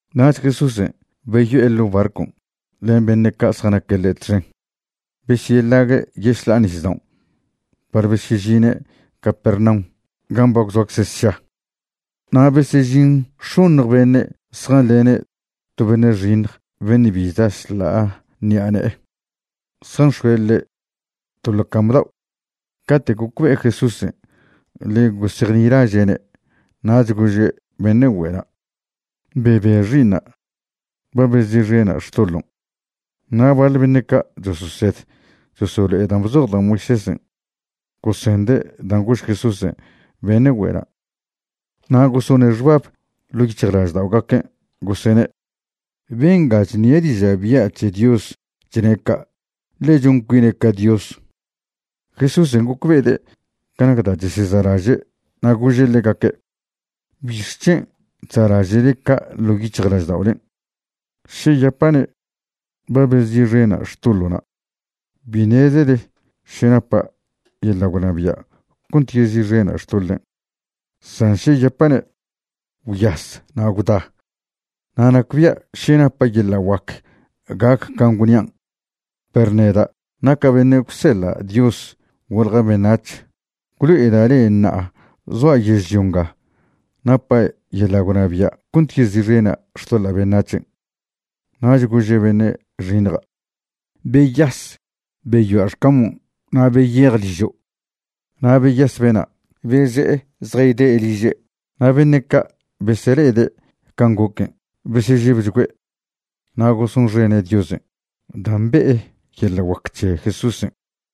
Nach Jesúsen' beyo'e ḻo' barcon' len beṉe' ca' zjanaque' ḻe' txen besyeḻague' yešḻa'a nisdaon' par besyežine' Capernaum gan' ba gwzoacze' sša. Na' besežin x̱oṉj beṉe' zjanḻene' to beṉe' xiṉj beṉe' bi chda šḻa'a ṉi'a ne'e, zjanx̱oe' ḻe' to ḻo cam dao'. Cate' gocbe'e Jesúsen' ḻe gosejnilaže'ne' nach gože' beṉe' güe'na': ―Bebe xi'iṉa'. Ba bezi'xena' xtoḻon'. Na' baḻ beṉe' ca' chososed chosolo'ede' dan' bzoj da' Moisésen' gosende' dan' gož Jesúsen' beṉe' güe'na' na' gosone' xbab ḻo' yic̱hjlažda'ogaquen' gosene': “Benga chṉie' diža' bya' c̱he Dios chne' ca', ḻe chon cuine' ca Dios.” Jesúsen' gocbe'ede' ca nac da' cheseza'laže', na' gože' ḻegaque': ―¿Bixc̱hen' chza'laže'le ca' ḻo' yic̱hjlažda'olen'? Še yapa'ne': “Ba bezi'xena' xtoḻo'na',” bi ṉezele še napa' yeḻa' gwnabia' cont yezi'xena' xtoḻen'. San še yapa'ne': “Gwyas na' gwda”, na' nacbia' še napa' yeḻa' guac gac can' gwnian'. Perw neda' naca' beṉe' gwseḻa' Dios golja' beṉac̱h gwlo'eda' le'e ṉa'a zoa' yežlio nga napa' yeḻa' gwnabia' cont yezi'xena' xtoḻa' beṉac̱hen'. Nach gože' beṉe' xiṉja': ―Beyas, beyoa' xcamon' na' beyej ližo'. Na' beyas bena', beze'e zjayde' liže'. Na' beṉe' ca' besele'ede' can' goquen' besežebchgüe'. Na' gosonxene' Diosen' dan' be'e yeḻa' guac c̱he Jesúsen'.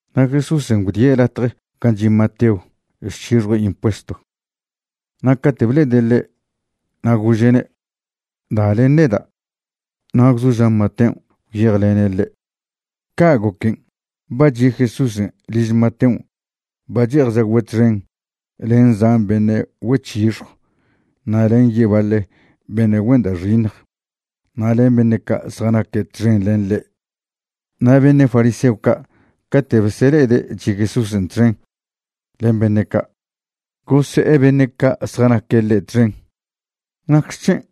Na' Jesúsen' gwdie' latje gan' chi' Mateo chc̱hixjue' impuesto. Na' cate' ble'ede' ḻe' na' gože'ne': ―Da len neda'. Na' gwzoža' Mateon' gwyejlene' ḻe'. Ca' goquen' ba chi' Jesúsen' liž Mateon' ba che'ej chagüe' txen len zan beṉe' güec̱hixjw na' len yebaḻe beṉe' güen da' xiṉj na' len beṉe' ca' zjanaque' txen len ḻe'. Na' beṉe' fariseo ca' cate' besele'ede' chi' Jesúsen' txen len beṉe' ca', gose'e beṉe' ca' zjanaque' ḻe' txen: ―¿Nacxec̱hen'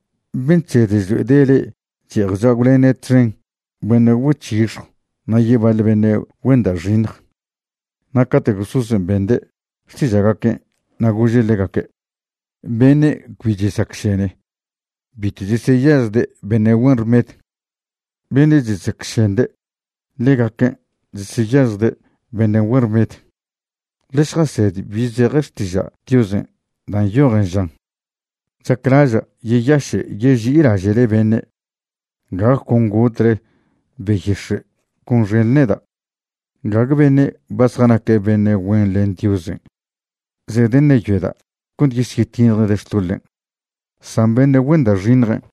ben' chsed chlo'ede' le'e che'ej chagwlene' txen beṉe' güec̱hixjw na' yebaḻe beṉe' güen da' xiṉj? Na' cate' Jesúsen' bende' xtiža'gaquen' na' gože' ḻegaque': ―Beṉe' cbi chesacšene bitw cheseyažjde' beṉe' güen rmed. Beṉe' chesacšende', ḻegaquen' cheseyažjde' beṉe' güen rmed. Ḻe šjased bi zeje Xtiža' Diosen' dan' nyojen žan: “Chaclaža' yeyaše' yeži'ilaže'le beṉe', gague con gotle beyix̱e' gonxenḻe neda'.” Gague beṉe' ba zjanaque' beṉe' güen len Diosen' zedeṉeyoeda' cont yesyetiṉjde' xtoḻen', san beṉe' güen da' xiṉjen'.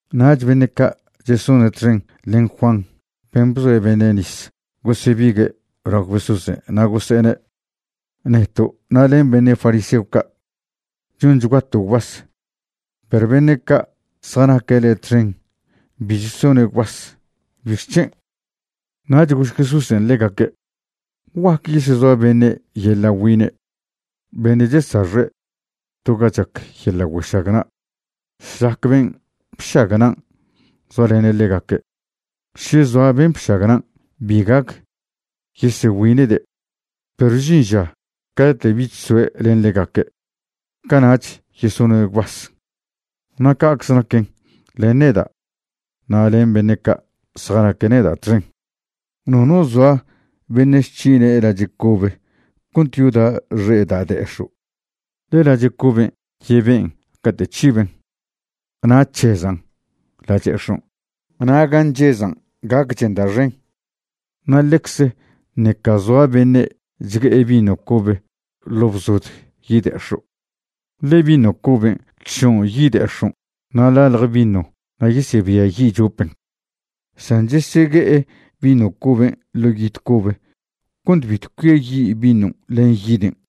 Nach beṉe' ca' chesone' txen len Juan ben' bzoe' beṉe' nis gosebigue' lao Jesúsen' na' gose'ene': ―Neto' na' len beṉe' fariseo ca' chonchguato' gwbas, perw beṉe' ca' zjanaque' le' txen bi chesone' gwbas. ¿Bixc̱hen'? Nach gož Jesúsen' ḻegaque': ―¿Guac yesezoa beṉe' yeḻa' güine' beṉe' chesaxe' to ga chac yeḻa' güešagna' šlac ben' bšagnan' zoalene' ḻegaque'? Še zoa ben' bšagnan' bi gac yesegüine'de'. Perw žin ža cate' bich soe' len ḻegaque', cana'ch yesone' gwbas. Na' ca'cze naquen len neda' na' len beṉe' ca' zjanaque' neda' txen. ’Nono zoa beṉe' chc̱hine' lache' cobe cont yoda' xe' da' de'ex̱o', ḻe lache' coben' yeben' cate' c̱hiben' na' c̱hezan' lache'ex̱on', na' gan' nchezan' gacchen da' xen. Na' ḻecze ṉeca zoa beṉe' chgue'e vino cobe ḻo' bzod yide'ex̱o', ḻe vino coben' chšon' yide'ex̱on' na' ḻalje vino na' yesebiayi' chopen. San chesegue'e vino coben' ḻo' yid cobe cont bitw cuiayi' vinon' len yiden'.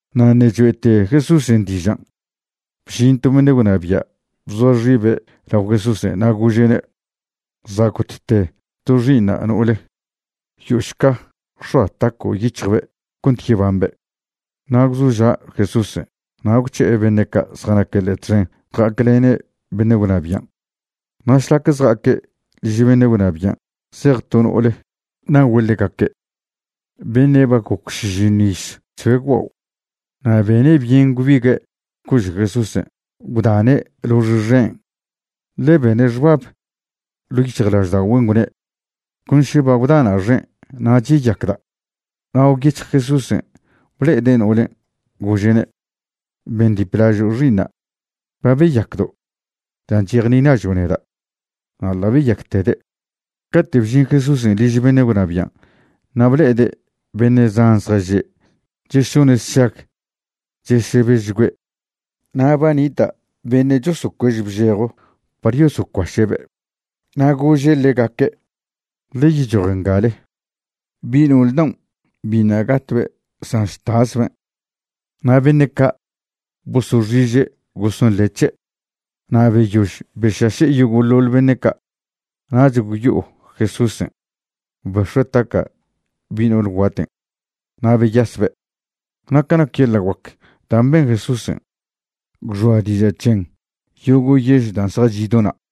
Na' ṉe' choe'te Jesúsen' dižan', bžin to beṉe' gwnabia' bzoa xibe' lao Jesúsen' na' gože'ne': ―Za' gotte to xi'iṉa' no'ole. Yo'ošca x̱oa taco' yic̱hjbe' cont yebambe'. Na' gwzoža' Jesúsen' na' gwc̱he'e beṉe' ca' zjanaque' ḻe' txen ja'aclene' beṉe' gwnabian'. Na' šlac zja'aque' liž beṉe' gwnabian' zej to no'ole nagüe' ḻegaque', beṉe' ba goc šižiṉw iz chzoe' gwbao', na' bene' byen gwbigue' cože' Jesúsen' gwdane' lox xen'. Ḻe bene' xbab ḻo' yic̱hjlažda'ogüen', gwne': “Con še ba gwdana' xen' nach yeyacda'.” Na' gwyec̱hj Jesúsen' ble'ede' no'olen', gože'ne': ―Bendiplažo' xi'iṉa'. Ba beyacdo' dan' chejnilažo' neda'. Na' ḻa' beyactede'. Cate' bžin Jesúsen' liž beṉe' gwnabian' na' ble'ede' beṉe' zan zjaže' chesone' sšag chesebežchgüe' na' ba nita' beṉe' chosocuež bžejo par yosocuaše'be'. Na' gože' ḻegaque': ―Ḻe yechoj ngale. Bi' no'ole daon' biṉa' gatbe', san chtasben'. Na' beṉe' ca' bosoxiže' gosonḻe' c̱he'. Na' beyož bešaše' yogo'ḻoḻ beṉe' ca', nach gwyo'o Jesúsen', bex̱ue' taca' bi' no'ol guaten', na' beyasbe'. Na' ca nac yeḻa' guac dan' ben Jesúsen', gwxoa diža' c̱hen yogo' yež dan' zjachi' do na'.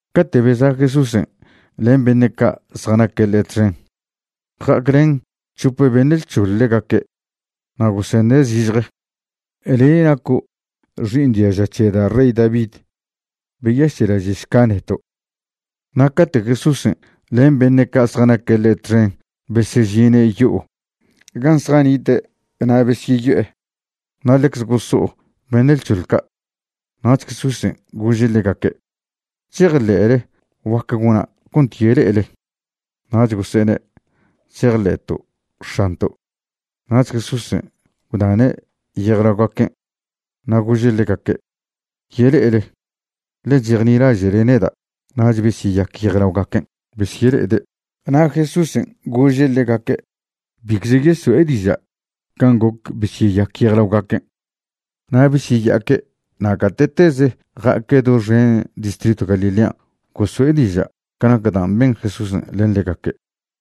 Cate' beza' Jesúsen' len beṉe' ca' zjanaque' ḻe' txen, ja'aclen c̱hope beṉe' lc̱hoḻ ḻegaque' na' gosene' zižje: ―Le' naco' xi'iṉ diaža c̱he da' rey David, beyaše'laže'šca neto'. Na' cate' Jesúsen' len beṉe' ca' zjanaque' ḻe' txen besežine' yo'o gan' zjanite' na' besyeyo'e, na' ḻecze goso'o beṉe' lc̱hoḻ ca'. Nach Jesúsen' gože' ḻegaque': ―¿Chejḻe'le guac gona' cont yele'ele? Nach gose'ene': ―Chejḻe'to' X̱anto'. Nach Jesúsen' gwdane' yejlaogaquen', na' gože' ḻegaque': ―Yele'ele, ḻe chejnilaže'le neda'. Nach besyeyac yejlaogaquen' besyele'ede'. Na' Jesúsen' gože' ḻegaque' bicze yeso'e diža' can' goc besyeyac yejlaogaquen'. Na' besyeya'aque' na' gate'tez ja'aque' doxen distritw Galilean' goso'e diža' ca nac dan' ben Jesúsen' len ḻegaque'.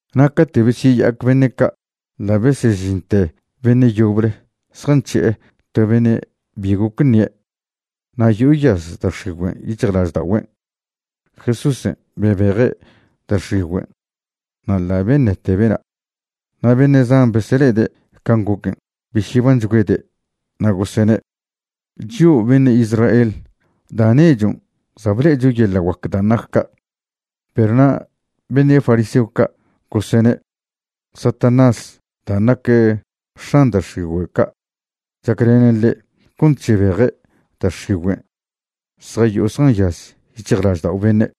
Na' cate' besyeya'ac beṉe' ca', ḻa' besežinte beṉe' yoble zjanc̱hi'e to beṉe' bi goc ṉie', na' yo'o yaz da' x̱igüen' yic̱hjlažda'ogüen'. Jesúsen' bebeje' da' x̱igüen' na' ḻa' beṉete bena'. Na' beṉe' zan besele'ede' can' goquen' besyebanchgüede', na' gosene': ―Chio' beṉe' Israel, da' nechon' za' ble'echo yeḻa' guac dan' nac ca'. Perw na' beṉe' fariseo ca' gosene': ―Satanás dan' nac x̱an da' x̱igüe' ca' chaclenen ḻe' cont chebeje' da' x̱igüen' zjayo'o zjanyaz yic̱hjlaždao' beṉe'.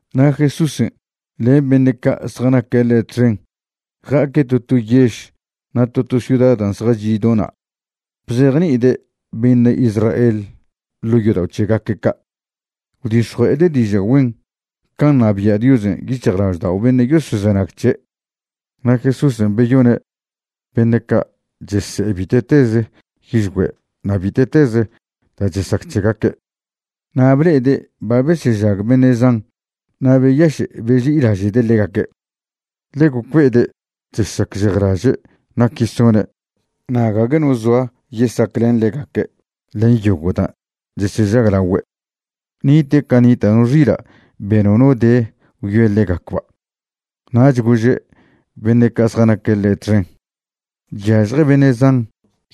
Na' Jesúsen' len beṉe' ca' zjanaque' ḻe' txen ja'aque' to to yež na' to to ciuda da' zjachi' do na' bzejni'ide' beṉe' Israel ḻo' yodao' c̱hegaque' ca', gwdix̱jue'ede' diža' güen can' ṉabia' Diosen' yic̱hjlaždao' beṉe' yosozenag c̱he'. Na' Jesúsen' beyone' beṉe' ca' chese'e bite'teze yižgüe' na' bite'teze da' chesac c̱hegaque'. Na' ble'ede' ba besežag beṉe' zan na' beyaše' beži'ilaže'de' ḻegaque', ḻe gocbe'ede' chesacžejlaže' nac yesone' na' gague no zoa yesaclen ḻegaque' len yogo' dan' chesežaglaogüe'. Nite' ca nita' no xila' be nono de gwyoe ḻegacba'. Nach gože' beṉe' ca' zjanaque' ḻe' txen: ―Chyažje beṉe' zan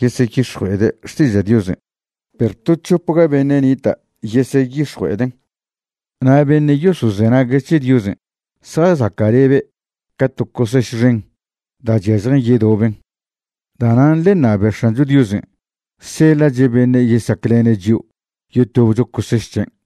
yeseyix̱jue'ede' xtiža' Diosen', perw to c̱hopga beṉe' nita' yeseyix̱jue'eden'. Na' beṉe' yosozenague' c̱he Diosen' zjazaca'lebe' ca to coseš xen da' chyažjen yedoben. Da'nan' ḻe ṉabe X̱ancho Diosen' seḻa'che' beṉe' yesaclene' chio' yotobcho coseš c̱hen'.